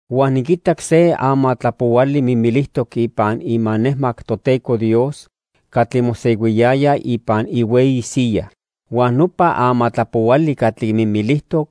Huan niquitac se amatlapohuali mimilijtoc ipan imanejmac Toteco Dios catli mosehuiyaya ipan ihueyi siyaj. Huan nopa amatlapohuali catli mimilijtoc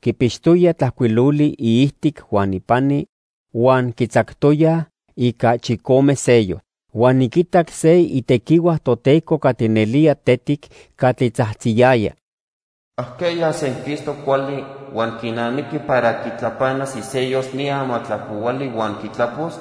quipixtoya tlajcuiloli iijtic huan ipani huan quitzactoyaj ica chicome sellos. Huan niquitac se itequihua Toteco catli nelía tetic catli tzajtziyaya: "¿Ajqueya senquistoc cuali huan quinamiqui para quitlapanas isellos ni amatlapohuali huan quitlapos?"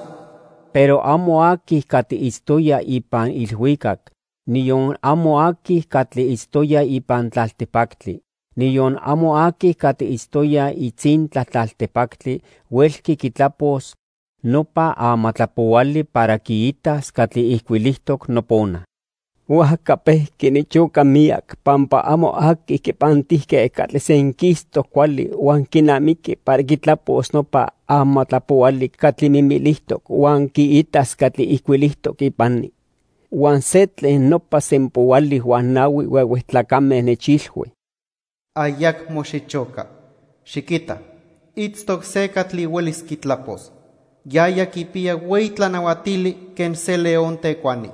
Pero amo aqui catli itztoya ipan ilhuicac, niyon amo aqui catli itztoya ipan tlaltipactli, niyon amo aqui catli itztoya itzintla tlaltipactli huelqui quitlapos nopa amatlapohuali para quiitas catli ijcuilijtoc nopona. Huajca pejqui nichoca miyac pampa amo aqui quipantijque catli senquistoc cuali huan quinamiqui para quitlapos nopa amatlapohuali catli mimilijtoc huan quiitas catli ijcuilijtoc ipani. Huan se tlen nopa sempoali huan nahui huehue tlacame nechilhui: "Ayacmo xichoca. Xiquita, itztoc se catli huelis quitlapos. Yaya quipiya hueyi tlanahuatili quen se león tecuani.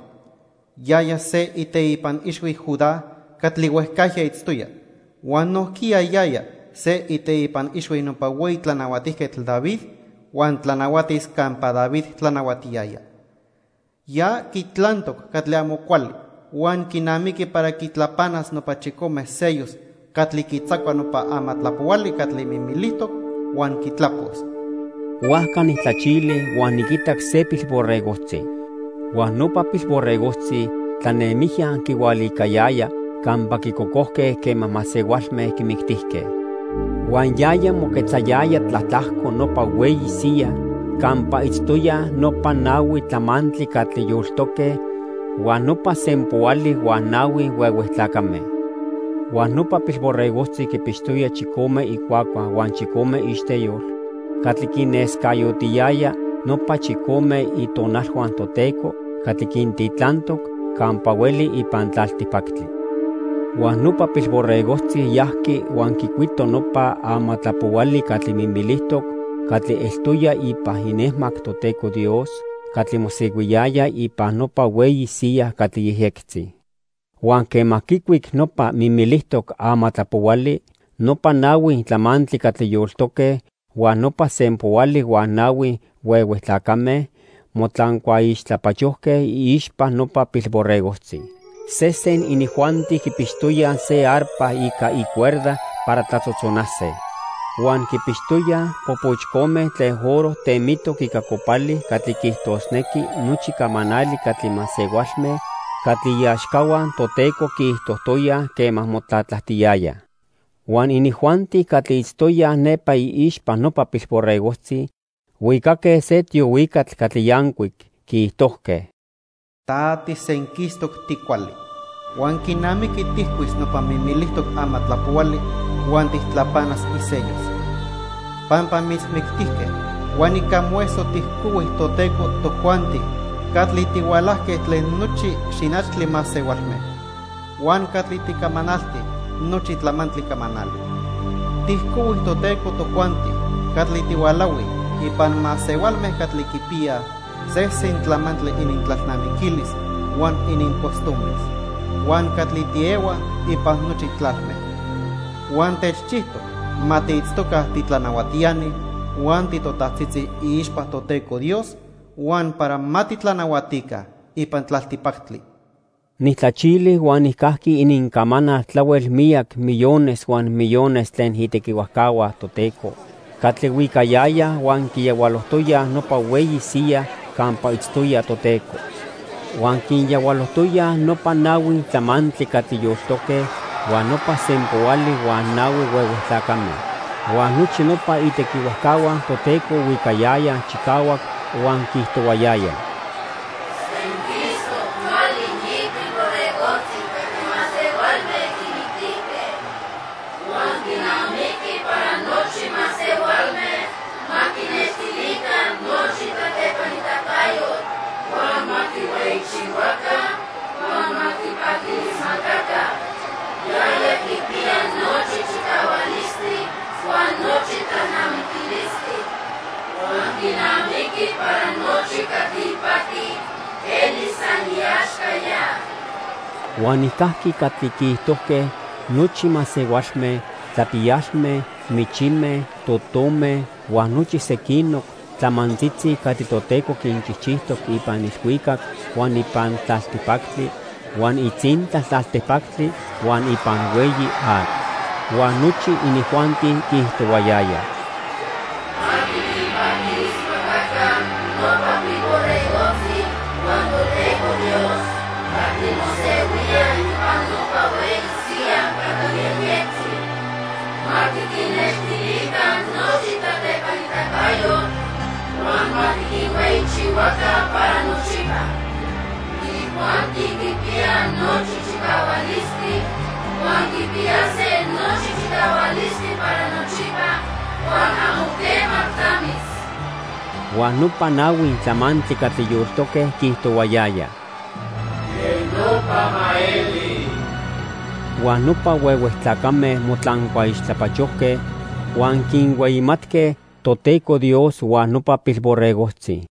Yaya se iteipan ixhui Judá catli huejcajya itztoya huan nojquiya yaya se iteipan ixhui nopa hueyi tlanahuatijquetl David huan tlanahuatis campa David tlanahuatiyaya. Ya quitlantoc catli amo cuali huan quinamiqui para quitlapanas nopa chicome sellos catli quitzacua nopa amatlapohuali catli mimilijtoc huan quitlapos." Huajca nijtlachili huan niquitac se Pilborregojtzi. Huan nopa Pilborregojtzi tlanemijya quihualicayaya campa quicocojque quema masehualme quimictijque. Huan yaya moquetzayaya tlatlajco nopa hueyi siya campa itztoyaj nopa nahui tlamantli catli yoltoque huan nopa sempoali huan nahui huehue tlacame. Huan nopa Pilborregojtzi quipixtoya chicome icuacua huan chicome iixteyol catli quinescayotiyaya nopa chicome Itonalhua Toteco catli quintitlantoc campa hueli ipan tlaltipactli. Huan nopa Pilborregojtzi yajqui huan quicuito nopa amatlapohuali catli mimilijtoc catli eltoya ipan inejmac Toteco Dios catli mosehuiyaya ipan nopa hueyi siya catli yejyectzi. Huan quema quicuic nopa mimilijtoc amatlapohuali, nopa nahui tlamantli catli yoltoque huan nopa sempoali huan nahui huehue tlacame motlancuaixtlapachojque iixpa nopa Pilborregojtzi. Sesen inijuanti quipixtoyaj se arpa ica icuerda para tlatzotzonase. Huan quipixtoyaj popochcome tlen oro temitoc ica copali catli quiijtosnequi nochi camanali catli masehualme catli iaxcahua Toteco quiijtojtoyaj quema motlatlajtiyayaj. Huan inijuanti catli itztoyaj nepa iixpa nopa Pilborregojtzi huicaque se tiohuicatl catli yancuic, quiijtojque: "Ta tisenquistoc ticuali. Huan quinamiqui tijcuis nopa mimilijtoc amatlapohuali huan tijtlapanas isellos. Pampa mitzmictijque huan ica moeso tijcohui Toteco tojuanti catli tihualajque tlen nochi xinachtli masehualme, huan catli ticamanaltij nochi tlamantli camanali. Tijcohui Toteco tojuanti catli tihualahuij ipan masehualme catli quipiyaj sesen tlamantli inintlalnamiquilis huan inincostumbres, huan catli tiehuaj ipan nochi tlalme. Huan techchijtoc ma tiitztoca titlanahuatiani huan titotajtzitzi iixpa Toteco Dios, huan para ma titlanahuatica ipan tlaltipactli." Nijtlachili huan nijcajqui inincamanal tlahuel miyac millones huan millones tlen itequihuajcahua Toteco catli huicayayaj huan quiyahualojtoyaj nopa hueyi siya campa itztoya Toteco. Huan quinyahualojtoyaj nopa nahui tlamantli catli yoltoque huan nopa sempoali huan nahui huehue tlacame. Huan nochi nopa itequihuajcahua Toteco huicayayaj chicahuac huan quiijtohuayayaj: "Senquistoc cuali ni Pilborregojtzi catli masehualme quimictijque. Huan quinamiqui para nochi masehualme ma quinextilica nochi tlatlepanitacayotl, huan ma quihueyichihuaca huan ma quipaquilismacaca. Yaya quipiya nochi chicahualistli huan nochi tlalnamiquilistli. Huan quinamiqui para nochi catli ipati elis san iaxca ya." Huan nijcajqui catli quiijtojque nochi masehualme, tlapiyalme, michime, totome, huan nochi sequinoc tlamantzitzi catli Toteco quinchijchijtoc ipan ilhuicac, huan ipan tlaltipactli, huan itzintla tlaltipactli, huan ipan hueyi atl. Huan nochi inijuanti quiijtohuayayaj: "Ma tiquinpaquilismacaca nopa Pilborregojtzi huan Toteco Dios catli mosehuía ipan nopa hueyi siya catli yejyectzi. Ma tiquinnextilica nochi tlatlepanitacayotl, huan ma tiquinhueyichihuaca para nochipa. Inijuanti quipiyaj nochi chicahualistli huan quipiyase nochi chicahualistli para nochipa huan amo quema tlamis." Huan nopa nahui tlamantli catli yoltoque quiijtohuayayaj: "¡Quej nopa ma eli!" Huan nopa huehue tlacame motlancuaixtlapachojque huan quinhueyimatque Toteco Dios huan nopa Pilborregojtzi.